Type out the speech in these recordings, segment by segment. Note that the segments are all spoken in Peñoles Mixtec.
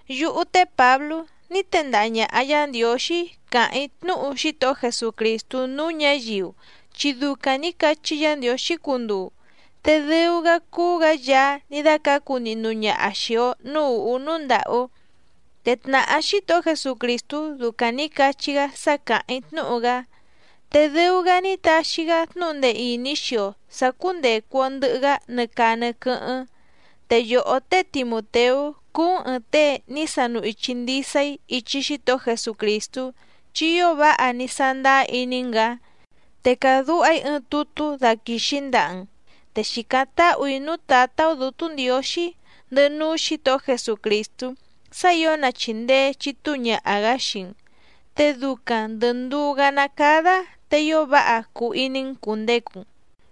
Yúhú té Pǎblú ní tendaha ñàha Yá Ndiǒxí càháⁿ‑í tnúhu Xítohó Jesucrìstú núú ñǎyiu chi ducaⁿ nǐ cachí Yǎ Ndiǒxí cunduu, te dɨu‑gá cúú‑gǎ Yaá ní dácǎcu nihnu ñaha xìi‑o núú ùhú núú ndàhú. Te tnàhá Xítohó Jesucrìstú ducaⁿ nǐ cachí‑gá sá càháⁿ‑í tnúhu‑gá, te dɨu‑gá ní taxi‑gá tnúhu ndee ìní xii‑o sǎ cúndècu‑o ndɨhɨ‑gá nɨ caa nɨ quɨ́hɨ́ⁿ. Te yòhó té Timùteú cúú‑n ɨ̀ɨⁿ tée ní sanu ichi ndisa‑í ichi Xítohó Jesucrìstú chi ío váha ní sándáá iní‑n‑gǎ. Te càdúha‑í ɨɨⁿ tutú daquìxi‑í ndaha‑n. Te xìcáⁿ táhù‑í núú Tǎtá‑ó Dǔtú Ndiǒxí ndɨhɨ núú Xǐtohó Jesucrìstú sá ǐo na chìndee chitúu ñaha‑gǎ xii‑n, te ducaⁿ ndɨ̀ nduú‑gá ná cádá te ío váha cuu iní‑n cùndecu‑n.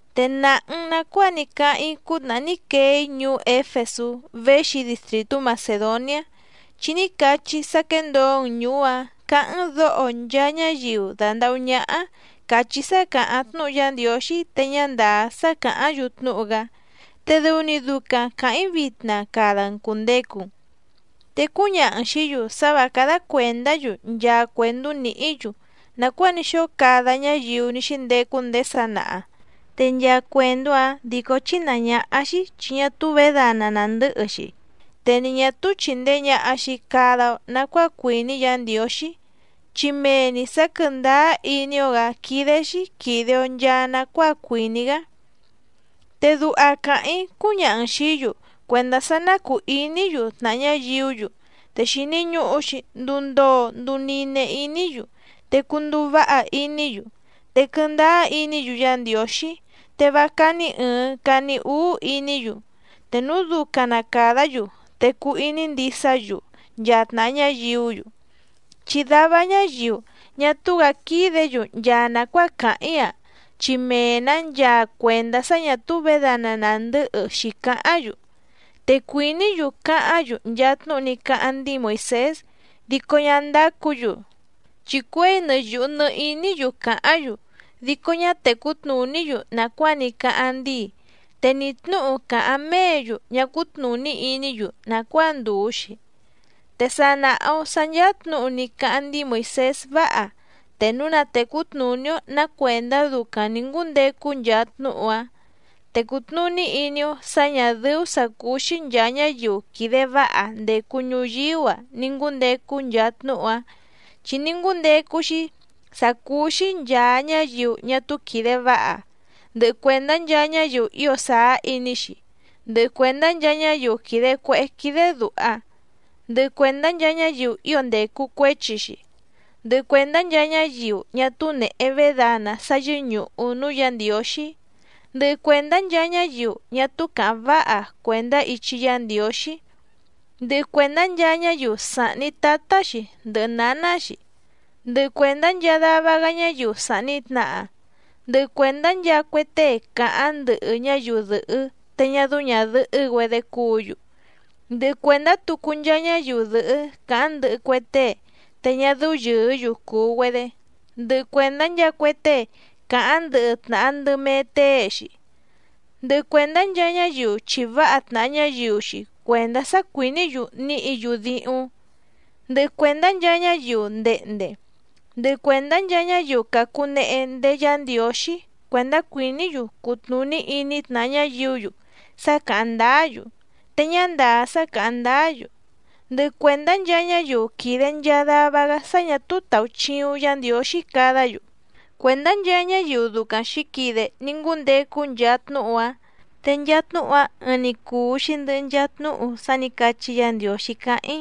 Te nàha‑n nacuáa ní cáháⁿ‑í cútnàhá ní quee‑í ñuú Éfesú véxi‑í distrìtú Macèdoniá, chi ní cachí‑í sá quéndǒo‑n ñùú‑áⁿ cǎháⁿ‑n dǒho nchaa ñáyiu dàndahú ñáhá càchí sá càháⁿ tnúhu Yá Ndiǒxí te ñá ndàá sá càháⁿ‑yu tnúhu‑gá, te dɨu‑ni ducaⁿ càháⁿ‑í vitna cada‑n cùndecu‑n. Te cúñaha‑n xìí‑yu sá vǎ cádá cuèndá‑yu nchaa cuèndú nìhí‑yu nàcuáa ní xóo cada ñáyiu ní xíndecu ndéé sanaha, te nchaa cuèndú‑áⁿ dìcó chínàá ñáhá‑xí chi ñá túú vědana nàndɨ́hɨ‑xi, te ni ñà túú chìndee ñaha‑xi cada‑o nacuáa cuìní Yǎ Ndiǒxí, chi mee‑ni sǎ quɨ̀ndáá iní‑ó‑gǎ quídé‑xí quìde‑o nchaa nacuáa cuìní‑gá. Te duha càháⁿ‑í cúñaha‑n xìí‑yu cuèndá sá ná cùu iní‑yu tnàha ñáyiú‑yu, te xìni ñuhu‑xi nduu ndoo nduu nine iní‑yu, te cunduu váha iní‑yu, te quɨndáá iní‑yu Yá Ndiǒxí, te vá cání ɨ̀ɨⁿ cani úú iní‑yu, te núu ducaⁿ na càdá‑yu te cuu iní ndisá‑yu nchaa tnàha ñáyiú‑yu. Chi dava ñáyiu ñá túú‑gǎ quídě‑yu nchaa nàcuáa càháⁿ‑í‑a, chi mee‑nǎ nchaa cuèndá sá ñǎ túú vědana nàndɨ́hɨ xǐcáháⁿ‑yu. Te cuìní‑yu cáháⁿ‑yu nchaa tnúhu ní cáháⁿ ndíi Moìsés dico ñá ndácǔ‑yu, chi cuěi nɨ yùhu nɨ iní‑yu càháⁿ‑yu dico ñá tècú tnùní‑yu nàcuáa ní cáháⁿ ndíi, te ni tnǔhu càháⁿ méě‑yu ñá cútnùní iní‑yu nàcuáa ndùu‑xi. Te sa nàha‑o sá ncháá tnǔhu ní cáháⁿ ndíi Moìsés váha, te núu na tècú tnùní‑ó nǎ cuèndá ducaⁿ nǐ ngúndecu nchaa tnúhu‑áⁿ. Te cùtnuní iní‑ó sǎ ñà dɨ́ú sǎ cúú‑xí nchàa ñáyiu quìde váha ndècu ñuyíú‑a ni ngǔndecu nchaa tnúhu‑áⁿ, chi ní ngúndecu‑xi sá cúú‑xí nchàa ñáyiu ñá túú quìde váha, ndɨhɨ cuèndá nchaa ñáyiu ío sàá iní‑xi, ndɨhɨ cuèndá nchaa ñáyiu quìde cuehé quídé dùha, ndɨhɨ cuèndá nchaa ñáyiu ío ndècu cuéchi‑xi, ndɨhɨ cuèndá nchaa ñáyiu ñá túú nèhe védana sá yɨ́ñùhu núú Yǎ Ndiǒxí, ndɨhɨ cuèndá nchaa ñáyiu ñá túú càháⁿ váha cuèndá ichi Yá Ndiǒxí, ndɨhɨ cuèndá nchaa ñáyiu sàhni tátá‑xi ndɨhɨ nǎná‑xi, ndɨhɨ cuèndá nchaa dava‑gá ñáyiu sàhni tnaha, ndɨhɨ cuèndá nchaa cue tée càháⁿ ndɨhɨ ñáyiu dɨ̀hɨ́ te ñá dɨ́ú ñàdɨhɨ́‑güedé cúǔ‑yu, ndɨhɨ cuèndá tucu nchaa ñáyiu dɨ̀hɨ́ càháⁿ ndɨhɨ cue tée te ñá dɨ́ú yɨ̀ɨ́‑yu cùu‑güedé, ndɨhɨ cuèndá nchaa cue tée càháⁿ ndɨhɨ tnàha ndɨ mee tée‑xi, ndɨhɨ cuèndá nchaa ñáyiu chìváha tnàha ñáyiu‑xi cuèndá sá cuìní‑yu níhǐ‑yu díhúⁿ, ndɨhɨ cuèndá nchaa ñáyiu ndehnde, ndɨhɨ cuèndá nchaa ñáyiu càcunehe ndéé Yǎ Ndiǒxí cuèndá cuìní‑yu cutnùní iní tnàha ñáyiú‑yu sá càháⁿ ndáá‑yu, te ñá ndàá sá càháⁿ ndáá‑yu, ndɨhɨ cuèndá nchaa ñáyiu quìde nchaa dava‑gá sá ñà túú tàuchiuⁿ Yá Ndiǒxí cadá‑yu. Cuèndá nchaa ñáyiu ducaⁿ xǐquide ní ngúndecu nchaa tnúhu‑áⁿ. Te nchaa tnúhu‑áⁿ ɨɨⁿ‑ni cùu‑xi ndɨhɨ nchaa tnúhu sá nǐ cachí Yǎ Ndiǒxí cáháⁿ‑í,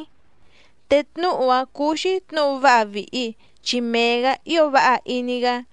te tnúhu‑áⁿ cúú‑xí tnǔhu váha vìhi, chi mee‑gǎ ío váha iní‑gá.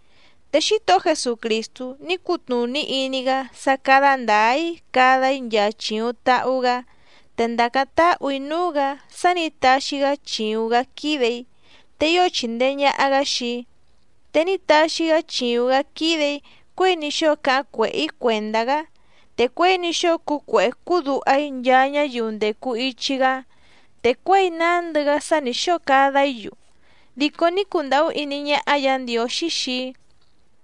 Te Xítohó Jesucrìstú ní cutnùní iní‑gá sá cádá ndǎá‑í cada‑í nchaa chìuⁿ tahu‑gá. Te ndàcáⁿ táhù‑í núú‑gǎ sá nǐ taxi‑gá chìuⁿ‑gá quídè‑í, te ío chìndee ñaha‑gá xii‑í. Te ní taxi‑gá chìuⁿ‑gá quídè‑í cuěi ní xóo cáháⁿ cuèhé‑í cuèndá‑gá, te cuěi ní xóo cúú cuèhé cúú duha‑í nchaa ñáyiu ndècu ichi‑gá, te cuěi nándɨ‑gá sá nǐ xóo cada‑í‑yu dico ní cundàhú iní ñáhá Yǎ Ndiǒxí xii‑í,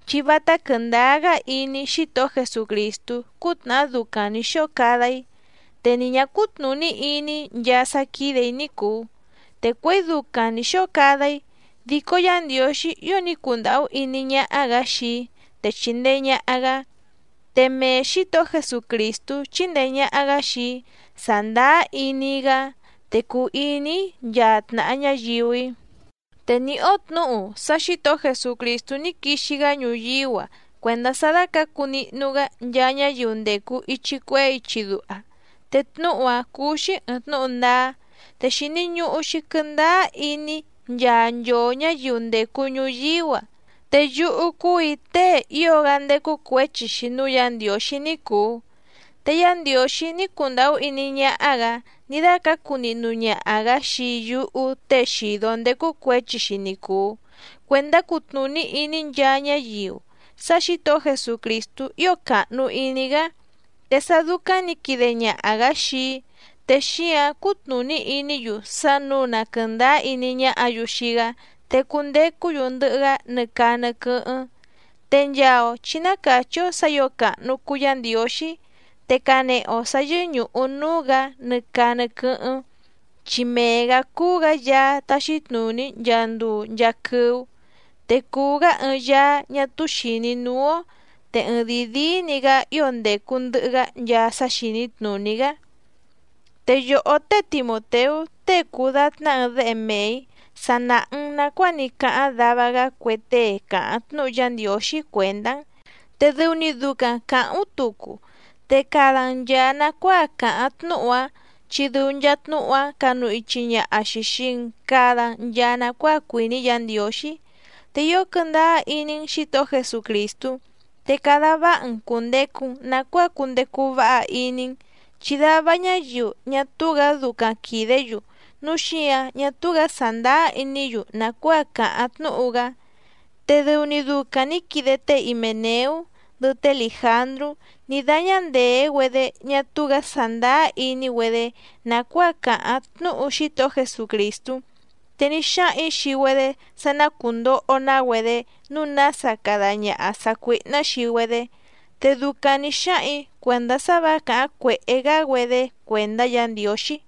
chi vátá quɨ̀ndáá‑gá iní‑í Xítohó Jesucrìstú cútnàhá ducaⁿ nǐ xóo cada‑í, te ni ñǎ cútnùní iní‑í nchaa sá quídè‑í ní cùu, te cuěi ducaⁿ nǐ xóo cada‑í, dico Yá Ndiǒxí ío ní cundàhú iní ñáhá‑gǎ xii‑í te chìndee ñaha‑gá. Te mee Xǐtohó Jesucrìstú chíndèe ñaha‑gá xii‑í sàndáá iní‑í‑gá, te cùu iní‑í nchaa tnàha ñáyiu‑í. Te nìhí‑ó tnǔhu sá Xǐtohó Jesucrìstú ní quixi‑gá ñuyíú‑a cuèndá sá dácǎcu nihnu‑gá nchaa ñáyiu ndècu ichi cuehé ichi duha. Te tnúhu‑áⁿ cúú‑xí ɨ̀ɨⁿ tnúhu ndáá, te xìni ñuhu‑xi quɨndáá iní nchaa nchoo ñǎyiu ndècu ñuyíú‑a. Te yúhú cúù‑í tée ío‑gá ndécú cuěchi‑xi núú Yǎ Ndiǒxí ní cùu. Te Yá Ndiǒxí ní cundàhú iní ñáhá‑gǎ ní dácǎcu nihnu ñaha‑gǎ xii yúhú tée xìdó ndécú cuěchi‑xi ni cùu, cuèndá cutnùní iní nchaa ñáyiu sá Xǐtohó Jesucrìstú ío càhnu iní‑gá. Te sá dúcáⁿ nǐ quide ñaha‑gǎ xii‑í, te xíǎⁿ cutnùní iní‑yu sá nǔu na quɨ̀ndáá iní ñáhǎ‑yu xii‑gá te cundecú‑yu ndɨhɨ‑gá nɨ caa nɨ quɨ́hɨ́ⁿ. Te nchaa‑o chǐ ná càchí‑ó sǎ ǐo càhnu cuu Yá Ndiǒxí, te canehe‑o sǎ yɨ́ñùhu núú‑gǎ nɨ caa nɨ quɨ́hɨ́ⁿ, chi mee‑gǎ cúú‑gǎ Yaá táxí tnùní nchaa nduu nchaa quɨ́ú. Te cùu‑gá ɨɨⁿ Yaá ñá túú xìní núú‑ó, te ɨɨⁿdìi díí‑ni‑gǎ ío ndècu ndɨhɨ‑gá nchaa sá xìní tnùní‑gá. Te yòhó té Timùteú tée cùu datná ɨɨⁿ déhe mee‑ǐ sa nàha‑n nacuáa ní cáháⁿ dava‑gá cue tée càháⁿ tnúhu Yá Ndiǒxí cuèndá‑n, te dɨu‑ni ducaⁿ càháⁿ‑ú tucu, te cada‑n nchàa nacuáa càháⁿ tnúhu‑áⁿ chi dɨu nchaa tnúhu‑áⁿ canu ichi ñaha‑xi xìi‑n cada‑n nchaa nacuáa cuìní Yǎ Ndiǒxí. Te ío quɨndáá iní‑n Xǐtohó Jesucrìstú, te cada váha‑n cùndecu‑n nacuáa cundecu váha iní‑n, chi dava ñáyiu ñá túú‑gǎ ducaⁿ quìdé‑yu núu xíǎⁿ ñá túú‑gǎ sàndáá iní‑yu nàcuáa càháⁿ tnúhu‑gá. Te dɨu‑ni ducaⁿ nǐ quide té Himèneú ndɨhɨ té Lìjandrú ní dáñá ndèé‑güedé ñá túú‑gǎ sàndáá iní‑güedé nàcuáa càháⁿ tnúhu Xítohó Jesucrìstú, te ní xáhaⁿ‑ǐ xii‑güedé sá ná cùndoho‑ná‑güedé nǔu nása cada ñaha sàcuíhná xii‑güedé, te ducaⁿ nǐ xáhaⁿ‑ǐ cuèndá sá vǎ càháⁿ cuèhé‑gá‑güedé cuèndá Yǎ Ndiǒxí.